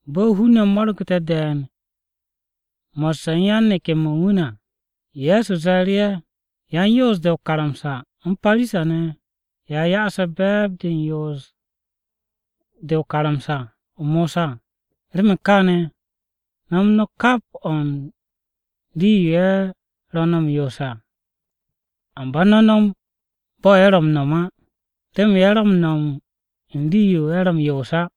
Bo̱ hun-ne̱ mo̱rgu̱te̱ de̱e̱n mo̱sse̱ u̱n yan-neke̱-mo̱ u̱n wu̱ ne̱ à, Ye̱so ze̱e̱ru̱ ye̱, “Yan-Yoos-de o-karamsa u̱n Parisa-ne̱, ye̱ a ya'ase̱ be̱e̱b-de u̱n yoos-de u̱n karamsa-o Mosa. Remen kaane̱ no̱m no̱ kap o̱ u̱n rii-yo ye̱ ro̱ m-yoos à, amba no̱ no̱m bo̱ ye̱ ro̱ m-no̱m á. Remen ye̱ ro̱ m-no̱m u̱n rii-yo ye̱ ro̱ yoos á.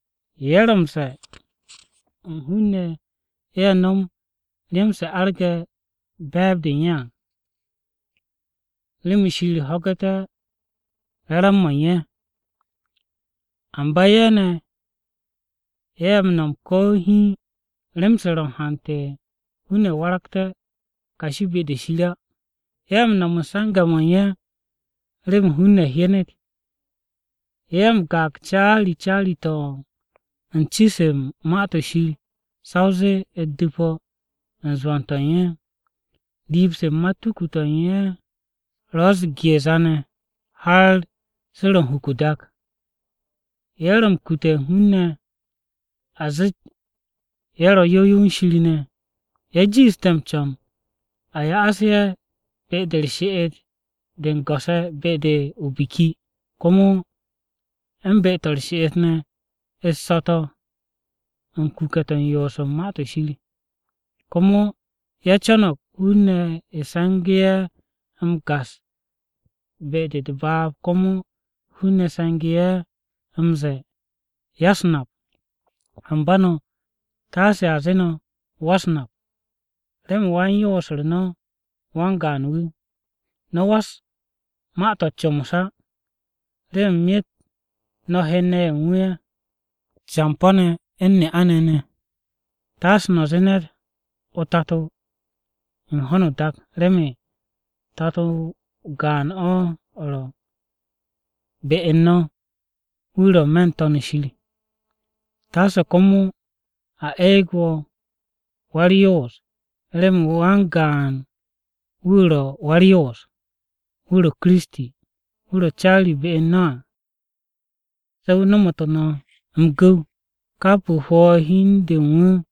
Ye̱ ro̱ m-ze̱e̱ u̱n hun-ne̱ ye̱ no̱m rem-se arge̱ be̱e̱b-de u̱n ye̱ à, remen Shir wu̱ ho̱gu̱té̱ re̱re̱m-mo̱ ye̱. Amba ye̱ ne̱, ye̱ m-no̱m ko̱ hiin rem-se ro̱ u̱n hante̱ hun-ne̱ ye̱ waragté̱ kashi be-de Shir á. “Ye̱ m-no̱m u̱n se̱nge̱-mo̱ u̱n ye̱ remen hun-ne̱ hyenet. Ye̱ m-gaag caari caari-to̱ u̱n ci-se u̱n Ma-to̱ Shir sa o zee u̱t-du̱po u̱n zwo̱n-to̱ u̱n ye̱, riib-se u̱n matuku-to̱ u̱n ye̱ ro̱ u̱s-geeza ne̱ har se ro̱ u̱n huk o-dak. Ye̱ ro̱ m-kute̱ u̱n hun-ne̱ a zeet ye̱ ro̱ yow yow u̱n Shir ne̱. Ye̱ jiishte̱ m-co̱n a ya'as ye̱ be-de u̱r-she'et de u̱n go̱s-ye̱ be-de o-biki, komo u̱n be-to̱ u̱r-she'et ne̱ u̱t-so̱to̱ u̱n kuke̱-to̱ u̱n yoos u̱n Ma-to̱ Shir. Komo ye̱ co̱no̱g hun-ne̱ se̱ngu̱ ye̱ m-gas be-de u̱t-baab komo hun-ne̱ se̱ngu̱ ye̱ m-ze̱e̱, ‘Ya-u̱s-Nap.’ “Amba no̱, taase a zee no̱ ‘Wa-u̱s-Nap,’ remen wan-yoos-u̱r no̱ wan-gaan wu̱. No̱ was ma-to̱ u̱t-comos á, remen myet no̱ hen-ne̱ ye̱ u̱n wu̱ ne̱ ye̱, campo̱-ne̱ u̱n ne'a-ne̱ ne̱. Taase no̱ zee ne̱t ‘o-Tato’ u̱n ho̱no o-dak remen Tato o-gaan o̱ ro̱ be u̱n no̱ wu̱ ro̱ n-me̱ n-To̱n shir. Taase komo a eeg wo̱ ‘Wa-u̱r-Yoos,’ remen wan-gaan wu̱ ro̱ Wa-u̱r-Yoos, wu̱ ro̱, Kiristi. Wu̱ ro̱ caari be u̱n no̱ à, se̱ wu̱ nomotu̱ no̱ m-gu̱w. Kap wu̱ hwo̱ hi u̱n de u̱n wu̱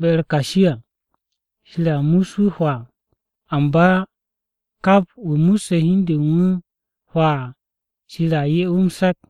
be-u̱r kashi à, Shir a mus wu̱ hwaa. Amba kap wu̱ musse̱ hi u̱n de u̱n wu̱ hwaa à, Shir a 'ye wu̱ m-se̱k.”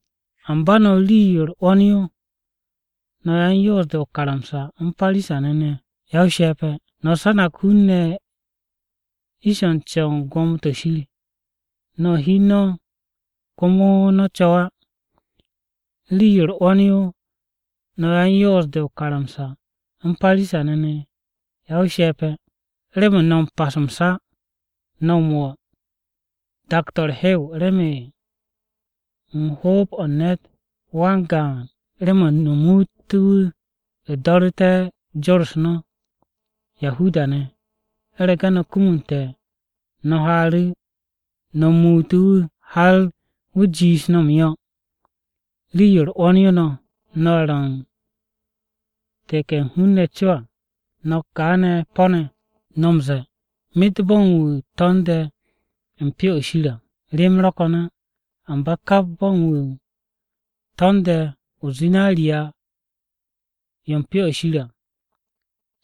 “Amba no̱ rii-yo u̱r-'wo̱n yo, no̱ yan-Yoos-de o-karamsa u̱n Parisa-ne̱. Ya-o-she̱pe̱! No̱ sanag hun-ne̱ ish-o̱ m-co̱w u̱n gwo̱mo-to̱ Shir. No̱ u̱n hi u̱n no̱ komo no̱ co̱w á. “Rii-yo u̱r-'wo̱n yo no̱ yan-Yoos-de o-karamsa u̱n Parisa-ne̱. Ya-o-she̱pe̱! Remen no̱ m-pas m-sa, no̱ m-wo̱ dak-to̱ u̱r-hew remen hoob-o̱ u̱n ne̱t wan-gaan remen no̱ muut wu̱ do̱ru̱te̱ jor no̱ Yahuda-ne̱. U̱rege̱ no̱ kumunte̱, no̱ haaru̱ no̱ muutu̱ wu̱ har wu̱ jiish no̱ m-yo̱. “Rii-yo u̱r-'wo̱n yo no̱, no̱ ye̱ ro̱ u̱n take̱ u̱n hun-ne̱ co à, no̱kka ne̱ po̱-ne̱! No̱ m-ze̱e̱, ‘Myet bo̱ u̱n wu̱ to̱nde̱ u̱n Pyo-o̱ Shir à, rem ro̱ ko̱n á, amba kap bo̱ u̱n wu̱ to̱nde̱ o-zinariya yo u̱n Pyo-o̱ Shir à,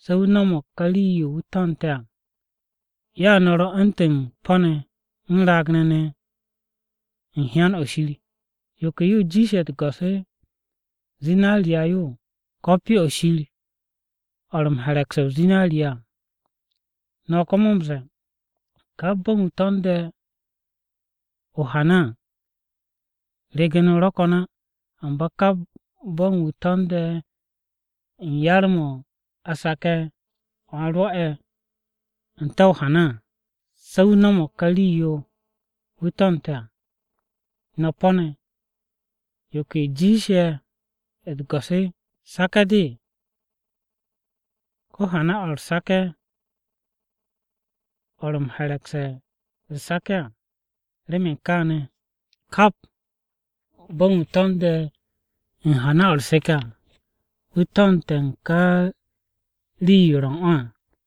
se̱ wu̱ no̱mo̱g ká rii-yo wu̱ to̱nte̱ à.’ Ya no̱ ro̱ u̱ntu̱n po̱-ne̱ u̱n raag-ne̱ ne̱ u̱n hyan-o Shir. ¿Yo ke yo jiishe̱ u̱t-go̱s: zinariya yo, ko̱ Pyo-o̱ Shir o̱ ro̱ m-herekse̱ o-zinariya à? No̱ komo m-ze̱e̱, ‘Kap bo̱ u̱n wu̱ to̱nde̱ o-hana à, regen-o ro̱ ko̱n á, amba kap bo̱ u̱n wu̱ to̱nde̱ u̱n yar-mo̱ a sake̱ n-te̱ o-hana à, se̱ wu̱ no̱mo̱g ká rii-yo wu̱ to̱nte̱ à.’ No̱ po̱-ne̱! ¿Yo ke yo jiishe̱ u̱t-go̱s? ¿Sake̱-de, ko̱ hana-o̱ u̱r-sake̱ o̱ ro̱ m-herekse̱ u̱r-sake̱ à? Remen kaane̱ kap bo̱ u̱n wu̱ to̱nde̱ u̱n hana-o̱ u̱r-seke̱ à, wu̱ to̱nte̱ u̱n ka rii-yo ro̱ u̱n o̱ à.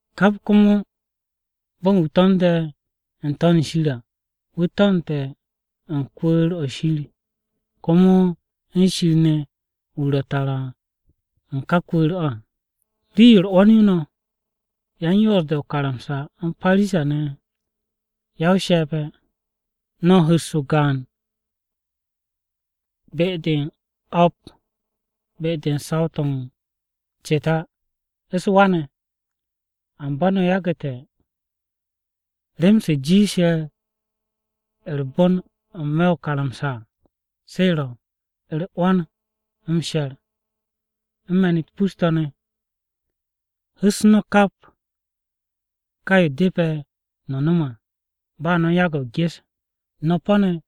Kap komo bo̱ u̱n wu̱ to̱nde̱ n-To̱n shir à, wu̱ to̱nte̱ u̱n kwu̱u̱r-o̱ Shir, komo u̱n Shir ne̱ wu̱ ro̱ tara u̱n ká kwu̱u̱r-o̱ à. “Rii-yo u̱r-'wo̱n yo no̱, yan-Yoos-de o-karamsa u̱n Parisa-ne̱. Ya-o-she̱pe̱! No̱ m-hu̱s o-gaan be-de u̱n o̱p be-de u̱n saw-to̱ u̱n ceta u̱s-wa ne̱. Amba no̱ yagu̱te̱ rem-se jiishe̱ u̱r-bon n-me̱ o-karamsa à, se ro̱: u̱r-'wo̱n, m-she̱r, u̱n me̱n-u̱t pus-to̱ ne̱. Hu̱s no̱ kap, ka yo depe̱ no̱ nom à, ba no̱ u̱n yage̱ o-ges. No̱ po̱-ne̱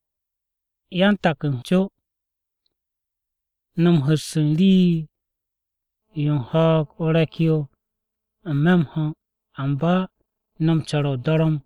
yan-taku̱ u̱n co! No̱ m-hu̱s u̱n rii-yo u̱n ho̱o̱g-o re̱k-yo n-me̱ m-ho̱, amba no̱ co̱re̱ o-dorom!”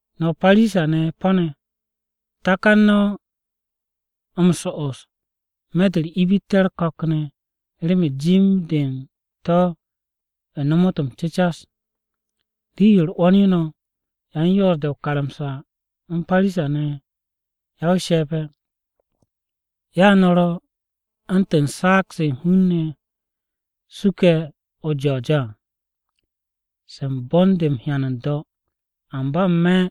No̱ Parisa-ne̱ po̱-ne̱! Takan no̱ so'os n-me̱ de u̱r-ibitte̱ u̱r-ko̱k ne̱, remen jim-de u̱n to̱ nomot m-cecas. “Rii-yo u̱r-'wo̱n yo no̱, yan-Yoos-de o-karamsa u̱n Parisa-ne̱. Ya-o-she̱pe̱! Ya no̱ ro̱ u̱ntu̱n saag-se hun-ne̱ suke̱ o-jo̱jo̱ à, se u̱n bon-de m-hyan n-do̱, amba n-me̱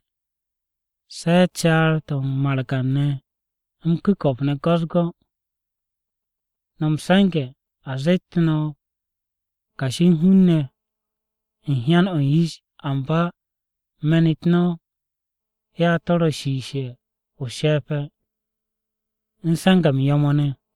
se̱ caar-to̱ u̱n margan-ne̱, m-ku̱ko̱p ne̱ go̱-u̱s-go̱. No̱ m-se̱nge̱ a zeet no̱ ro̱ kashi u̱n hun-ne̱ u̱n hyan-o̱ u̱n yish, amba me̱n-u̱t no̱, ya to̱ ro̱ shiishe̱ o-she̱pe̱ u̱n se̱nge̱-m yo̱-mo̱ ne̱.”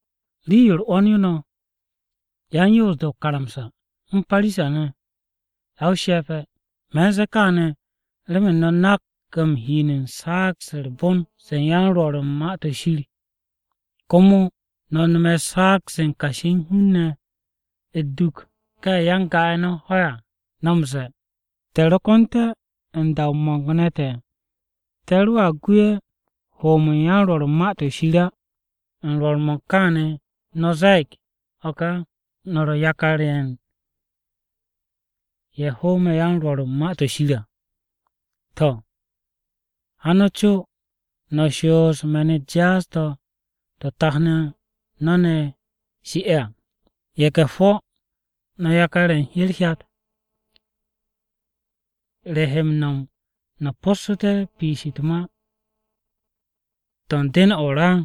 “Rii-yo u̱r-'wo̱n yo no̱ yan-Yoos-de o-karamsa u̱n Parisa-ne̱. Ya-o-she̱pe̱! Me̱n ze̱e̱ kaane̱ remen no̱ nak m-hin u̱n saag-se u̱r-bon se u̱n yan-Rwo̱r u̱n Ma-to̱ Shir, komo no̱ nome̱ saag-se u̱n kashi u̱n hun-ne̱ u̱t-duk ka ye̱ ya-n-ga-ye̱ no̱ ho à. No̱ m-ze̱e̱, ‘Te̱ ro ko̱nte̱ u̱n da-o mo̱ng-ne̱ te̱, te̱ roa gu ye̱ hoom u̱n yan-Rwo̱r u̱n Ma-to̱ Shir á.’ U̱n rwo̱r-mo̱ u̱n káane̱, no̱ ze̱e̱g o̱ ka no̱ ro̱ yakar u̱n ye̱ hoome̱ yan-Rwo̱r u̱n Ma-to̱ Shir à. To̱, ha no̱ co no̱ shoos me̱n-u̱t jaas-to̱ to̱ tat no̱ ne̱ shi'ne̱ à! No̱ ye̱ge̱-hwo̱! No̱ yakar-ye̱ u̱n herhyat! ¿Re no̱ he m-no̱m no̱ po̱ssu̱te̱ piish u̱t-ma to̱ u̱n den-o̱ o-ra?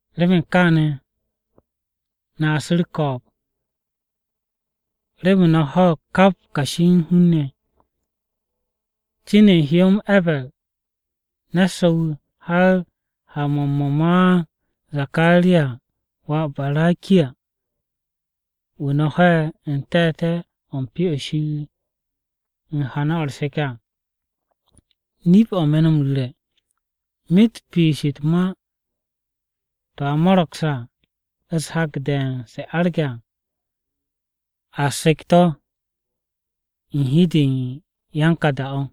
Remen kaane̱, no̱a su̱ u̱r-ko̱o̱b remen no̱ ho̱o̱g kap kashi u̱n hun-ne̱. Cin u̱n hyó-m E̱ber ne̱t so̱-wu̱. Har ha-mo̱ u̱n mo̱ ma Zakaraya wà Barakiya, wu̱ no̱ ho'e̱ u̱n te̱te̱-o̱ u̱n Pyo-o̱ Shir u̱n hana-o̱ u̱r-seke̱ à. Nip-o̱ me̱ no̱ m-ru̱re̱, myet piish u̱t-ma to̱ a mo̱ro̱gse̱ à, u̱s-hak de̱e̱n se arge̱ à, a sek to̱ u̱n hi-de u̱n yan ka da-o.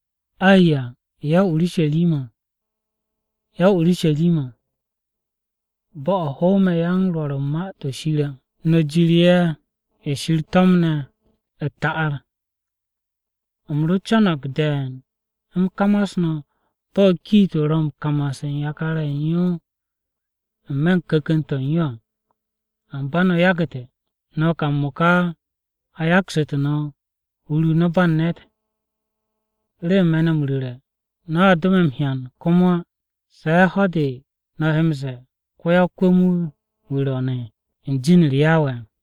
“Ayya ya-o-Urusharima, ya-o-Urusharima! Bo̱-o̱ hoome̱ yan-Rwo̱r u̱n Ma-to̱ Shir, no̱ jir ye̱ Shir to̱mnu̱ no̱ à u̱t-ta'ar! U̱m ro co̱no̱g de̱e̱n u̱m kamas no̱ bo̱ kiit-o ro̱ m-kamas u̱n yakar-ye̱ u̱n yo n-me̱ u̱n ku̱ku̱n-to̱ u̱n yo à, amba no̱ yagu̱te̱. No̱ ka m-mo̱ka a yaksu̱tu̱ no̱ hur-o no̱ ba u̱n ne̱t! Remen me̱ no̱ m-ru̱re̱, no̱a do me̱ m-hyan komo á, se̱ ho̱-de no̱ he m-ze̱e̱, ‘Ko-ya-o-kwu̱m-wu̱, wu̱ ro̱o̱ne̱ u̱n be̱e̱b-u̱r Yawe à!’”